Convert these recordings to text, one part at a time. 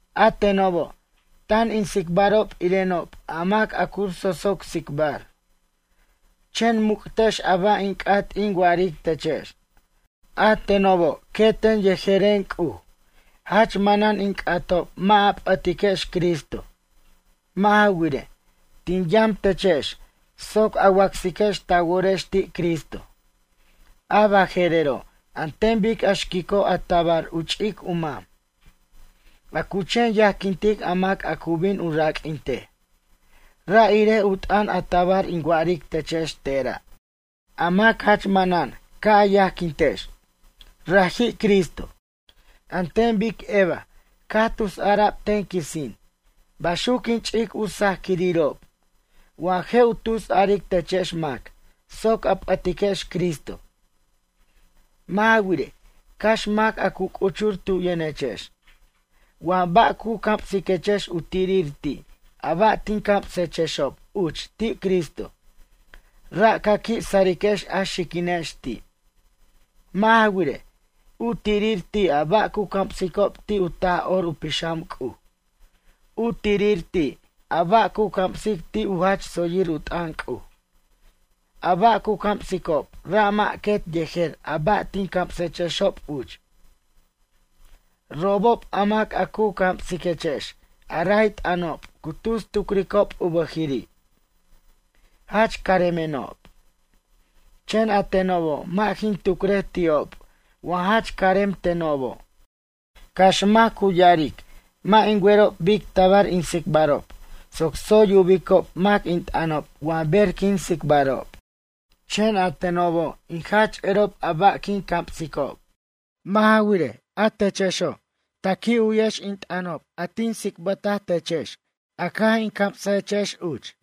A tenobo' tan in tsicbarob irenob a mac a cu sosoc tsicbar. Chen muc'tex a ba' in c'at in wa'aric techex. A tenobo' queten yejeren C'uj, jach manan in c'atob mʌ' a p'ʌtiquex Cristo. Mʌ' ja wirej, tin yam techex soc a wacsiquex ta worex ti' Cristo. A baje'rero' an ten bic a xquico' a tabar u ch'ic u mam, a cu chen yajquintic a mac a cu bin u raq'uintej. Ra' irej u t'ʌn a tabar in wa'aric techex tera'. A mac jach manan ca' a yajquintex. raji' Cristo. An ten bic Eva caj tus ara'b ten quisin baxuc quin ch'ic u sajquirirob wa je' u tus aric techex mac soc a p'ʌtiquex Cristo. Mʌ' ja wirej, cax mac a cu c'uchur tu yʌnechex wa ba' cu camsiquechex u tirir ti' a ba' tin camsechexob uch ti' Cristo, ra' ca qui' sariquex a xiquinex ti'. Mʌ' ja wirej, u tirir ti' a ba' cu camsicob ti' u Taj'or u Pixam C'uj. U tirir ti' a ba' cu camsicob ti' u jach tsoyir u t'ʌn C'uj. A ba' cu camsicob ra' mʌ' quet yejer a ba' tin camsechexob uch. Robob a mac a cu camsiquechex a ray t'ʌnob cu tus tucricob u bʌjiri': “Jach caremenob”, chen a tenobo' mʌ' jin tucrej ti'ob wa jach carem tenobo'. Cax mac cu ya'aric mʌ' in werob bic tabar in tsicbarob soc tsoy yubicob mac in t'ʌnob wa ber quin tsicbarob. Chen a tenobo' in jach erob a ba' quin camsicob. Mʌ' ja wirej, a techexo' ta qui' u'yex in t'ʌnob a tin ts'ibtechexob caj in camsajechexob uch.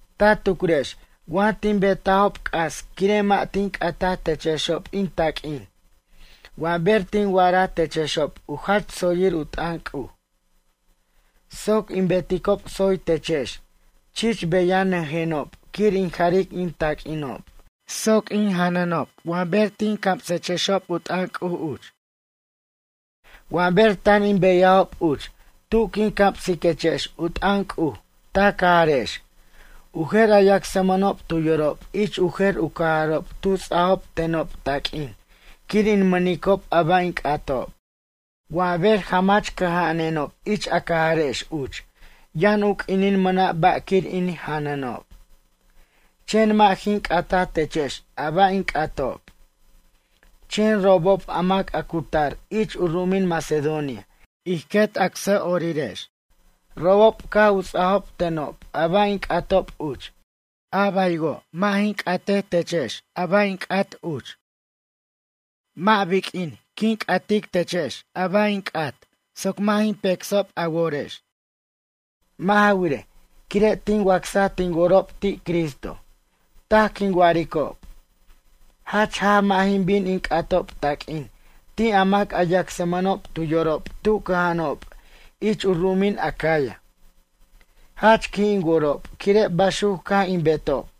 Ta tucrex wa tin betajob c'as quire' mʌ' tin c'ataj techexob in taq'uin wa ber tin wa'ara techexob u jach tsoyir u t'ʌn C'uj? Soc in beticob tsoy techex chich beyajnʌjenob quir in jaric in taq'uinob soc in janʌnob wa ber tin camsechexob u t'ʌn C'uj uch. Wa ber tan in beyajob uch tu quin camsiquechex u t'ʌn C'uj ta cajarex, u jer a yacsmʌnob tu yorob ich u jer u cajarob tu ts'ajob tenob taq'uin quir in mʌnic a ba' in c'atob. Wa ber jamach cʌja'ajenob ich a cajarex uch yʌn u q'uinin mʌna' ba' quir in janʌnob. Chen mʌ' jin c'ataj techex a ba' in c'atob. Chen robob a mac a cu tar ich u ru'umin Macedonia, ij quet acsa'orirex, robob caj u ts'ajob tenob a ba' in c'atob uch. A baywo' mʌ' jin c'atechexob a ba' in c'at uch. Mʌ' biq'uin je' in c'atechexob a ba' in c'at soc mʌ' jin pecsob a worex. Mʌ' ja wirej, quire' tin wacsaj tin worob ti' Cristo, taj quin wa'aricob. Jach jaj mʌ' jin bin in c'atob taq'uin ti' a mac a yacsmʌnob tu yorob tu cʌja'anob ich u ru'umin Acaya. Jach qui' in worob quire' baxuc caj in betob.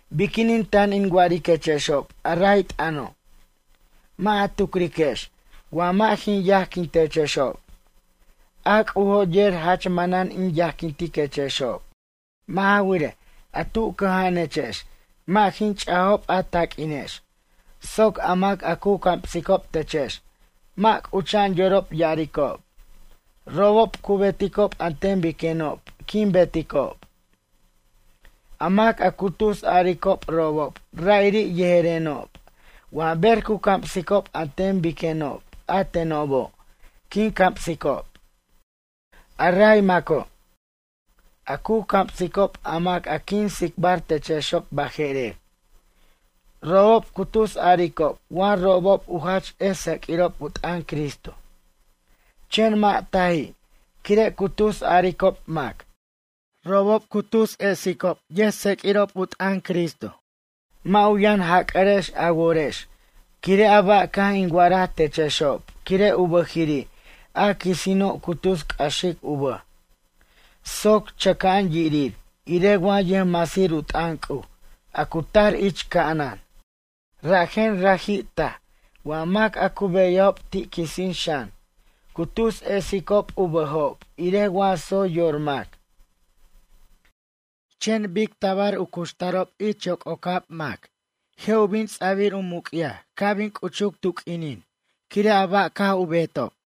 Biquinin tan in wa'ariquechexob a ray t'ʌno'? Mʌ' a tucriquex wa mʌ' jin yajquin techexob? A C'ujo' yer jach manan in yajquintiquechexob. Mʌ' ja wirej, a tu cʌja'anechex mʌ' jin ch'ajob a taq'uinex soc a mac a cu camsicob techex mʌ' c'ucha'an yorob ya'aricob, robob cu beticob an ten biquenob quin beticob. A mac a cu tus aricob robob ra'iri' yejerenob wa ber cu camsicob an ten biquenob a tenobo' quin camsicob. A ray maco' a cu camsicob a mac a quin tsicbar techexob baje'rer, robob cu tus aricob wa robob u jach ʌj tseq'uirob u t'ʌn Cristo, chen mʌ' taji' quire' cu tus aricob mac. Robob cu tus ets'icob ʌjtseq'uirob u t'ʌn Cristo. Mʌ' u yʌn jac'arex a worex quire' a ba' caj in wa'ara techexob quire' u bʌjiri' a quisino' cu tus c'axic u bʌj soc chʌca'an yirir irej wa yʌjmasir u t'ʌn C'uj a cu tar ich ca'anan. Rajen raji' taj wa mac a cu beyajob ti' quisin xan cu tus esicob u bʌjob irej wa tsoy yor mac. Chen bic tabar u cuxtarob ich yoc'ocab mac je' u bin ts'abir u muc'yaj ca' bin c'uchuc tu q'uinin quire' a ba' caj u betob.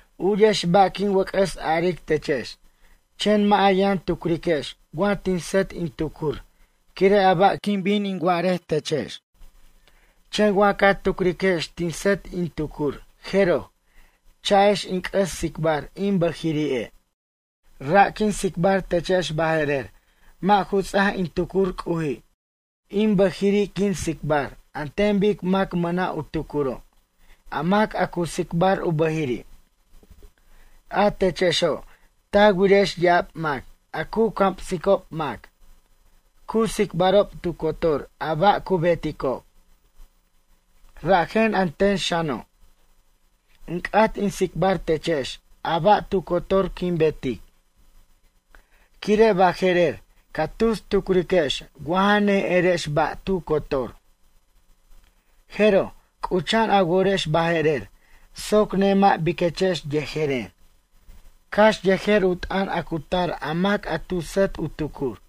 U'yex ba' quin wʌc'ʌs aric techex, chen mʌ' a yʌn tucriquex wa tin sʌt in tucur quire' a ba' quin bin in wa'arej techex. Chen wa ca tucriquex tin sʌt in tucur jeroj, cha'ex in c'ʌs tsicbar in bʌjiri'e'. Ra' quin tsicbar techex baje'rer mʌ' ju ts'aj in tucur C'uji'. In bʌjiri' quin tsicbar an ten bic mac mʌna' u tucuro', a mac a cu tsicbar u bʌjiri'. A techexo' ta wirex ya'ab mac a cu camsicob mac, cu tsicbarob tu cotor a ba' cu beticob. Rajen a ten xano', in c'at in tsicbar techex a ba' tu cotor quin betic. Quire' baje'rer ca tus tucriquex wa ja ne'erex ba' tu cotor. Jeroj, c'ucha'an a worex baje'rer soc nemʌ' biquechex yejeren, cax yejer u t'ʌn a cu tar a mac a tu sʌt u tucur.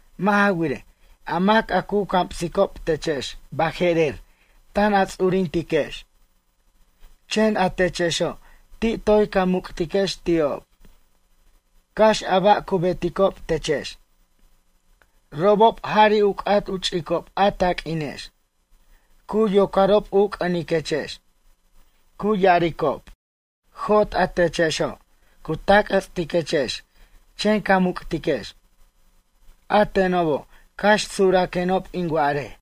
Mʌ' ja wirej, a mac a cu camsicob techex baje'rer tan a ts'urintiquex. Chen a techexo' ti' toy ca muc'tiquex ti'ob, cax a ba' cu beticob techex. Robob jari' u c'at u ch'icob a taq'uinex, cu yocarob u c'ʌniquechex. Cu ya'aricob: “Jot a techexo'”, cu tac'jʌts'iquechex, chen ca muc'tiquex. A tenobo' cax suraquenob in wa'arej.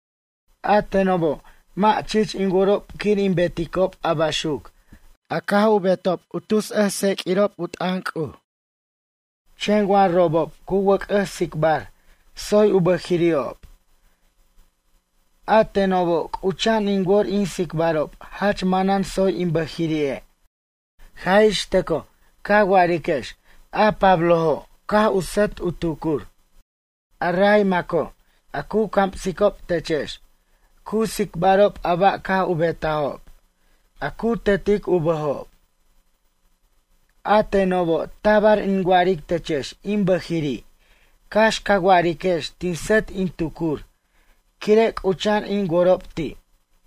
A tenobo' mʌ' chich in worob quir in beticob a baxuc a caj u betob a tus ets' yʌjtseq'uirob u t'ʌn C'uj. Chen wa robob cu wʌc'ʌs tsicbar tsoy u bʌjiri'ob. A tenobo' c'ucha'an in wor in tsicbarob jach manan tsoy in bʌjiri'e' jaj ix tʌcoj ca wa'ariquex a Pablojo' caj u sʌt u tucur. A ray maco' a cu camsicob techex, cu tsicbarob a ba' caj u betajob, a cu tetic u bʌjob. A tenobo' tabar in wa'aric techex in bʌjiri' cax ca wa'ariquex tin sʌt in tucur quire' c'ucha'an in worob ti'.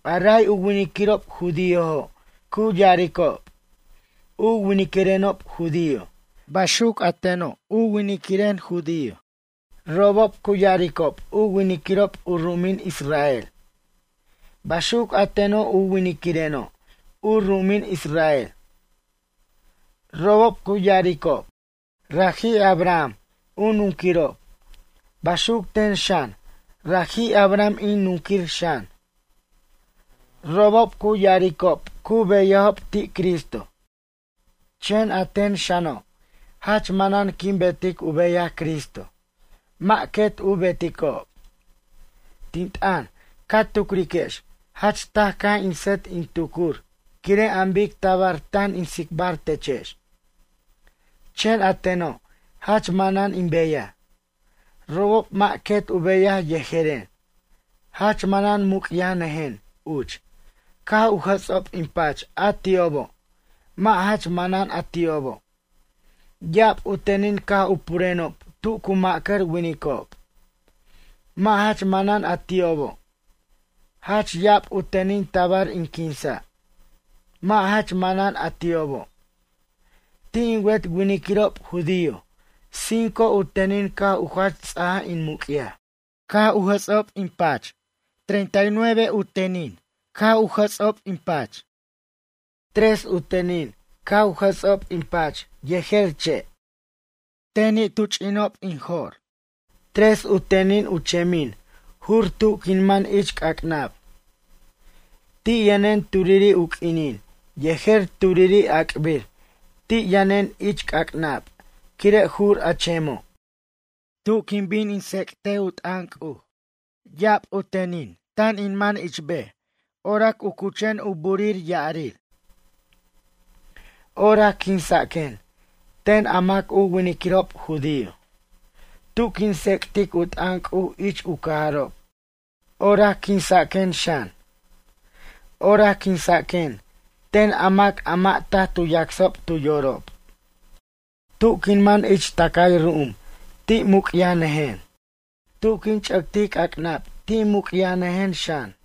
A ray u winiquirob judiojo' cu ya'aricob: U winiquirenob judio, baxuc a teno' u winiquiren judío. Robob cu ya'aricob u winiquirob u ru'umin Israel, baxuc a teno' u winiquireno' u ru'umin Israel. Robob cu ya'aricob: Raji' Abraham u nunquirob, baxuc ten xan, raji' Abraham in nunquir xan. Robob cu ya'aricob cu beyajob ti' Cristo. Chen a ten xano', jach manan quin betic u beyaj Cristo, mʌ' quet u beticob. Tin t'ʌn, ca tucriquex jach taj caj in sʌt in tucur quire' an bic tabar tan in tsicbar techex. Chen a teno' jach manan in beyaj, robob mʌ' quet u beyaj yejeren. Jach manan muc'yajnʌjen uch caj u jʌts'ob in pach a ti'obo' mʌ' jach manan a ti'obo'. Ya'ab u tenin caj purenob tu cu ma'cʌr winicob, mʌ' jach manan a ti'obo'. Jach ya'ab u tenin tabar in quinsa', mʌ' jach manan a ti'obo'. Ti' in wet winiquirob judío cinco u tenin caj u jach ts'aj in muc'yaj, caj u jʌts'ob in pach treinta y nueve u jats'ʌr in pach. Tres u tenin caj u jʌts'ob in pach yejer che', tenin tu ch'inob in jo'r, tres u tenin u chemin jur tu quin man ich c'ac'nab. Ti' yʌnen turiri' u q'uinin yejer turiri' ac'bir ti' yʌnen ich c'ac'nab quire' jur a chemo'. Tu quin bin in tsec't u t'ʌn C'uj ya'ab u tenin tan in man ich bej orac u cuchen u burij ya'arir. Orac quinsaquen ten a mʌ' u winiquirob judío. Tu quin tsec'tic u t'ʌn C'uj ich u cajarob orac quinsaquen xan. Orac quinsaquen ten a mac a mʌ' taj tu yacsob tu yorob. Tu quin man ich tʌcay ru'um ti' muc'yajnʌjen. Tu quin ch'ʌctic c'ac'nab ti' muc'yajnʌjen xan.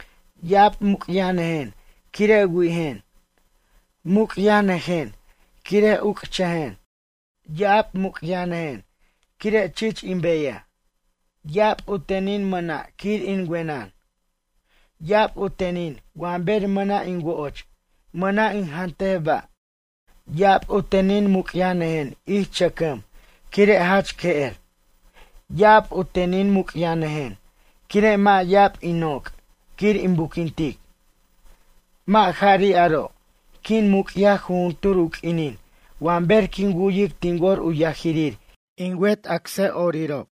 Ya'ab muc'yajnʌjen quire' wi'ijen. Muc'yajnʌjen quire' uc'chʌjen. Ya'ab muc'yajnʌjen quire' chich in beyaj. Ya'ab u tenin mʌna' quir in wenʌn. Ya'ab u tenin wa ber mʌna' in wo'och mʌna' in jantej ba'. Ya'ab u tenin muc'yajnʌjen ich chʌcʌm quire' jach que'er. Ya'ab u tenin muc'yajnʌjen quire' mʌ' ya'ab in noc' quir in buquintic. Mʌ' jari' aro', quin muc'yaj jujuntur u q'uinin wa ber quin wu'yic tin wor u yajirir in wet acsa'orirob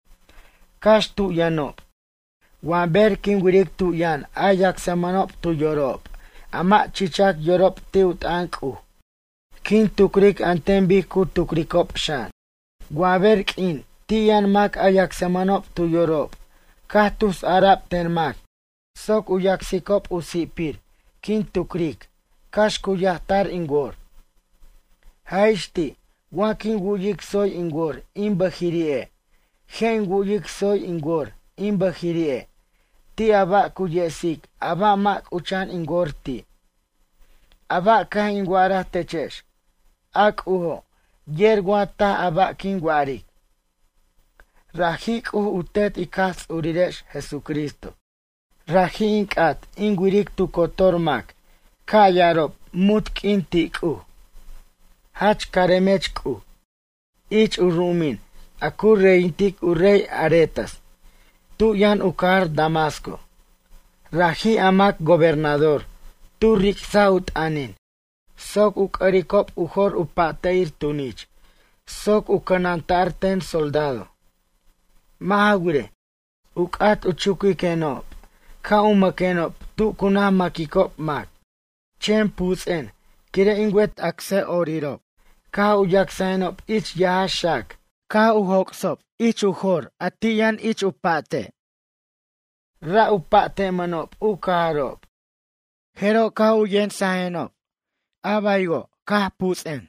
cax tu yʌnob. Wa ber quin wiric tu yʌn a yacsmʌnob tu yorob a mʌ' chichac yorob ti' u t'ʌn C'uj quin tucric an ten bic cu tucricob xan. Wa ber q'uin ti' yʌn mac a yacsmʌnob tu yorob caj tus ara'b ten mac soc u yacsicob u si'pir quin tucric cax cu yajtar in wor. Jaj ix ti' wa quin wu'yic tsoy in wor in bʌjiri'e' je' in wu'yic tsoy in wor in bʌjiri'e' ti' a ba' cu yesic a ba' mʌ' c'ucha'an in wor ti'. A ba' caj in wa'araj techex, a C'ujo' yer wa taj a ba' quin wa'aric. Raji' C'uj u Tet ic Jaj Ts'urirex Jesucristo. Raji' in c'at in wiric tu cotor mac ca' ya'arob munt q'uin ti' C'uj: “Jach caremech C'uj!” Ich u ru'umin a cu reyintic u rey Aretas, tu yʌn u cajar Damasco. Raji' a mac gobernador tu ric'saj u t'ʌnin soc u c'ʌricob u jor u pa'te'ir tunich soc u cʌnanta'r ten soldado. Mʌ' ja wirej, u c'at u chuquiqenob ca' u mʌquenob tu cu naj maquicob mac. Chen puts'en quire' in wet acsa'orirob caj u yacsajenob ich yaja xac caj u joc'sob ich jor a ti' yʌn ich u pa'te' tu cu cha'anob. Ra' u pa'temʌnob u cajarob. Jeroj, caj u yemsajenob, a baywo' caj puts'en.